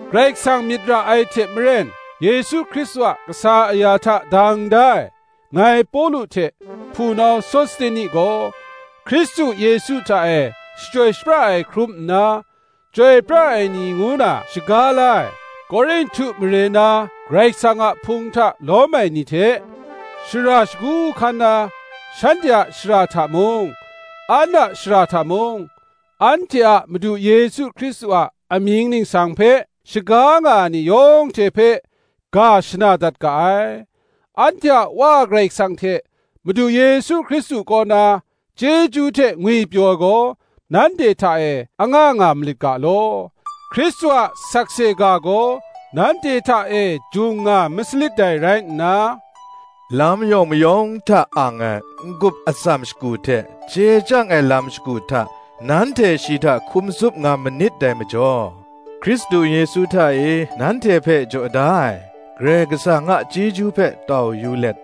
Karai Kasang myit ra ai hte maren, Yesu Hkristu a kasa aya hta dang da ai, ngai Pawlu hte hpunau Sosteni gaw, Hkristu Yesu hta e shachyoi shapra ai hkrum nna, chyoi pra ai ni ngu na shaga la ai, Korinhtu mare na Karai Kasang a Hpung hta lawm ai ni hte, shara shagu hkan na, shanhte a shara hta mung, an a shara hta mung, anhte a Madu Yesu Hkristu a amying ningsang hpe shaga nga ai ni yawng hte hpe, ga shana dat ga ai. Anhte a Wa Karai Kasang hte Madu Yesu Hkristu kaw na, chyeju hte ngwipyaw ai gaw, nanhte hta e anga nga malit ga law. Hkristu a sakse ga gaw nanhte hta e jung nga ma salit dai rai nna, lam yawng mayawng hta ang ai, n-gup atsam shagu hte, chye chyang ai lam shagu hta, nanhte shi hta hkum tsup nga manit dai majaw, Hkristu Yesu hta e nanhte hpe jaw da ai, Karai Kasang a chyeju hpe tau yu let,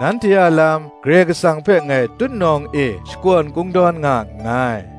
nanhte a lam Karai Kasang hpe ngai tutnawng e shakawn kungdawn nga nngai: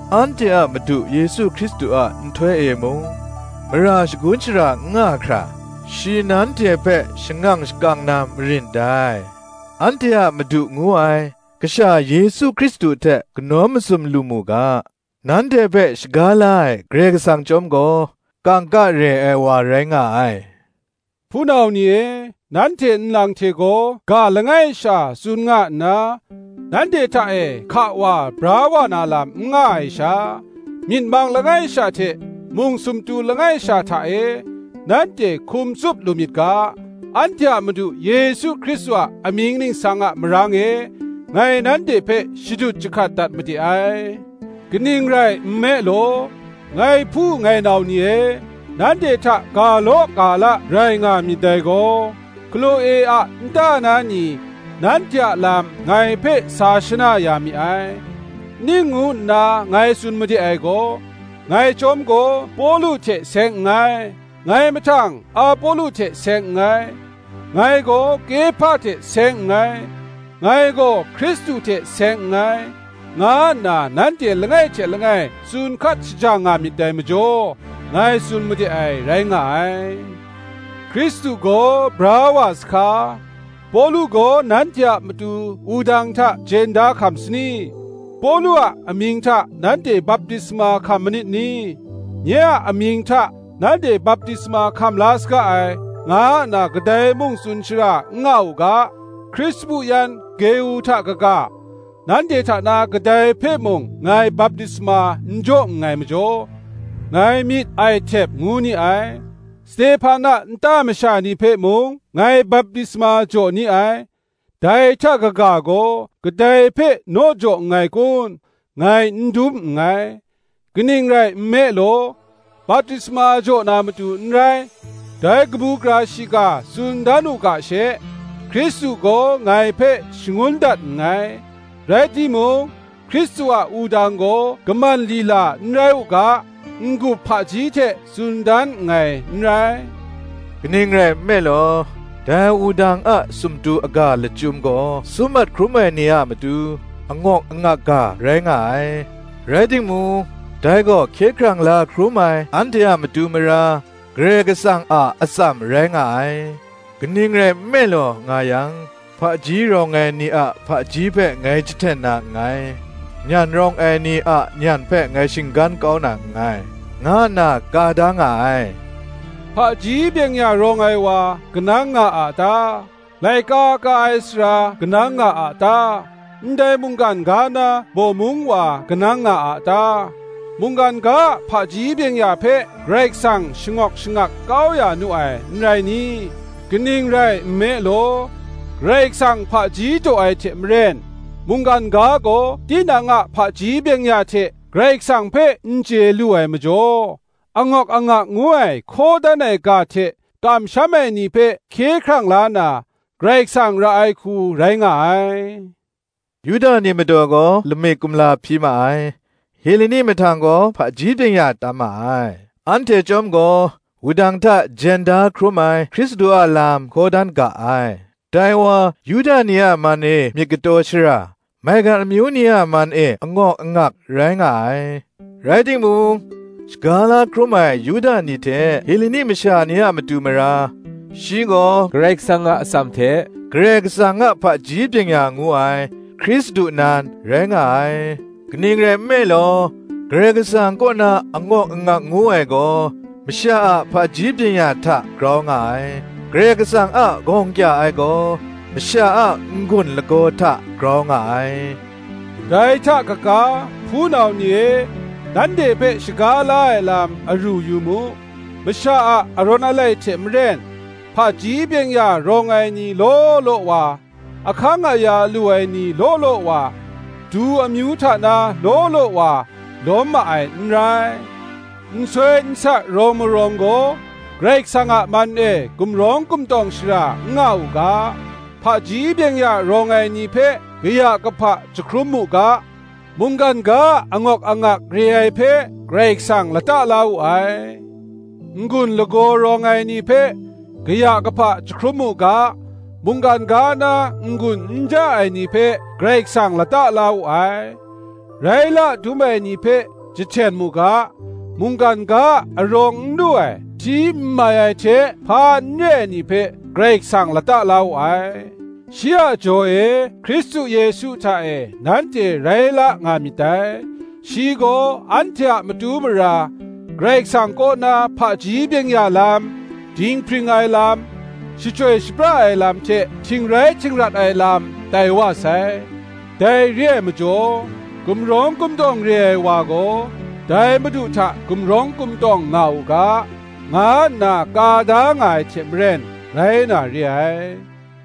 anhte a Madu Yesu Hkristu a nhtoi e mung, mara shagun shara n nga hkra, shi nanhte hpe shangang shakang na marin dai. Anhte a Madu ngu ai, Kasha Yesu Hkristu hte kanawn mazum lu mu ga, nanhte hpe shaga la ai Karai Kasang chyawm gaw, kangka re ai wa rai nga ai. Hpunau ni e, nanhte nlang hte gaw ga langai sha tsun nga nna, nanhte hta e hka wa bra wa na lam n nga ai sha, myit mang langai sha hte mung sumtu langai sha hta e nanhte hkum tsup lu myit ga, anhte a Madu Yesu Hkristu a amying ningsang a marang e, ngai nanhte hpe shadut jahkat dat made ai. Kaning rai nme law, ngai hpu ngai nau ni e, nanhte hta ga law ga la rai nga myit dai gaw, Hkloe a nta na ni, nanhte a lam ngai hpe sa shana ya mi ai. Ning ngu nna ngai tsun made ai gaw, “Ngai chyawm gaw Pawlu hte seng nngai, ngai mahtang Apolo hte seng nngai; ngai gaw Kehpa hte seng nngai, ngai gaw Hkristu hte seng nngai,” nga nna nanhte langai hte langai tsun hkat shajang nga myit dai majaw, ngai tsun made ai, rai nga ai. Hkristu gaw bra wa sahka? Pawlu gaw nanhte a matu wudang hta jen da hkam sa ni? Pawlu a amying hta nanhte baptisma hkam manit ni? Nye a amying hta nanhte baptisma hkam la saga ai, nga nna kadai mung tsun shara n nga u ga, Krispu yan Geu hta kaga, nanhte hta na kadai hpe mung ngai baptisma n jaw nngai majaw, ngai myit ai htep ngu ni ai. Stehpan a nta masha ni hpe mung ngai baptisma jaw ni ai; dai hta kaga gaw kadai hpe naw jaw nngai kun, ngai n dum nngai. Kaning rai nme law, baptisma jaw na matu n rai, dai kabu gara shiga tsun dan u ga she, Hkristu gaw ngai hpe shangun dat nngai: rai timung, Hkristu a wudang gaw kaman lila n rai u ga, n-gup hpaji hte tsun dan nngai n rai. Kaning rai nme law, dai wudang a sumtu aga lachyum gaw sum mat hkrum ai ni a matu, angawk angak ga rai nga ai; rai timung, dai gaw hkye hkrang la hkrum ai anhte a matu mara, Karai Kasang a atsam rai nga ai. Kaning rai nme law nga yang, “Hpaji rawng ai ni a hpaji hpe ngai jahten na nngai, Nyan rawng ai ni a nyan hpe ngai shinggan kau na nngai,” nga nna ka da nga ai. Hpaji byeng-ya rawng ai wa kanang nga a ta? laika ka ai sara kanang nga a ta? ndai mungkan ga na bawmung wa kanang nga a ta? Mungkan ga a hpaji byeng-ya hpe, Karai Kasang shangawk shangak kau ya nu ai, n rai ni? Kaning rai nme law, Karai Kasang hpaji daw ai hte maren, mungkan ga gaw tinang a hpaji byeng-ya hte Karai Kasang hpe n chye lu ai majaw, angawk angak ngu ai hkaw dan ai ga hte kamsham ai ni hpe hkye hkrang la na, Karai Kasang ra ai hku rai nga ai. Yuda ni madaw gaw lamik kumla hpyi ma ai; Heleni ni mahtang gaw hpaji byeng-ya tam ma ai: anhte chyawm gaw, Wudang hta jen da hkrum ai Hkristu a lam hkaw dan ga ai; dai wa Yuda ni a man e myit kataw shara, maigan amyu ni a man e angawk angak, rai nga ai: rai timung, shaga la hkrum ai Yuda ni hte Heleni masha ni a matu mara, shi gaw Karai Kasang a atsam hte, Karai Kasang a hpaji byeng-ya ngu ai, Hkristu nan, rai nga ai. Kaning rai nme law, Karai Kasang kaw na angawk angak ngu ai gaw, masha a hpaji byeng-ya hta grau nga ai: Karai Kasang a gawng kya ai gaw, masha a n-gun lagaw hta grau nga ai. Dai hta kaga, hpunau ni e nanhte hpe shaga la ai lam aru yu mu; masha a arawn alai hte maren, hpaji byeng-ya rawng ai ni law law wa, ahkang aya lu ai ni law law wa, du amyu hta na law law wa, lawm ma ai n rai. Nsoi nsa rawng marawng gaw Karai Kasang a man e gumrawng gumtawng shara n nga u ga, hpaji byeng-ya rawng ai ni hpe kaya kahpa jahkrum mu ga, mungkan ga a angawk angak re ai hpe Karai Kasang lata la wu ai; n-gun lagaw rawng ai ni hpe kaya kahpa jahkrum mu ga, mungkan ga na n-gun n ja ai ni hpe Karai Kasang lata la wu ai; rai la dum ai ni hpe jahten mu ga, mungkan ga a arawng n lu ai, hti n mai ai hte hpa n re ai ni hpe, Karai Kasang lata la wu ai. Shi a jaw e Hkristu Yesu hta e nanhte rai la nga myit dai: shi gaw, anhte a matu mara, Karai Kasang kaw na, hpaji byeng-ya lam, dinghpring ai lam, shachyoi shapra ai lam hte htingrai htingrat ai lam, tai wa sai. Dai re ai majaw, Gumrawng gumtawng re ai wa gaw, dai Madu hta gumrawng gumtawng nga u ga, nga nna ka da nga ai hte maren, rai na re ai.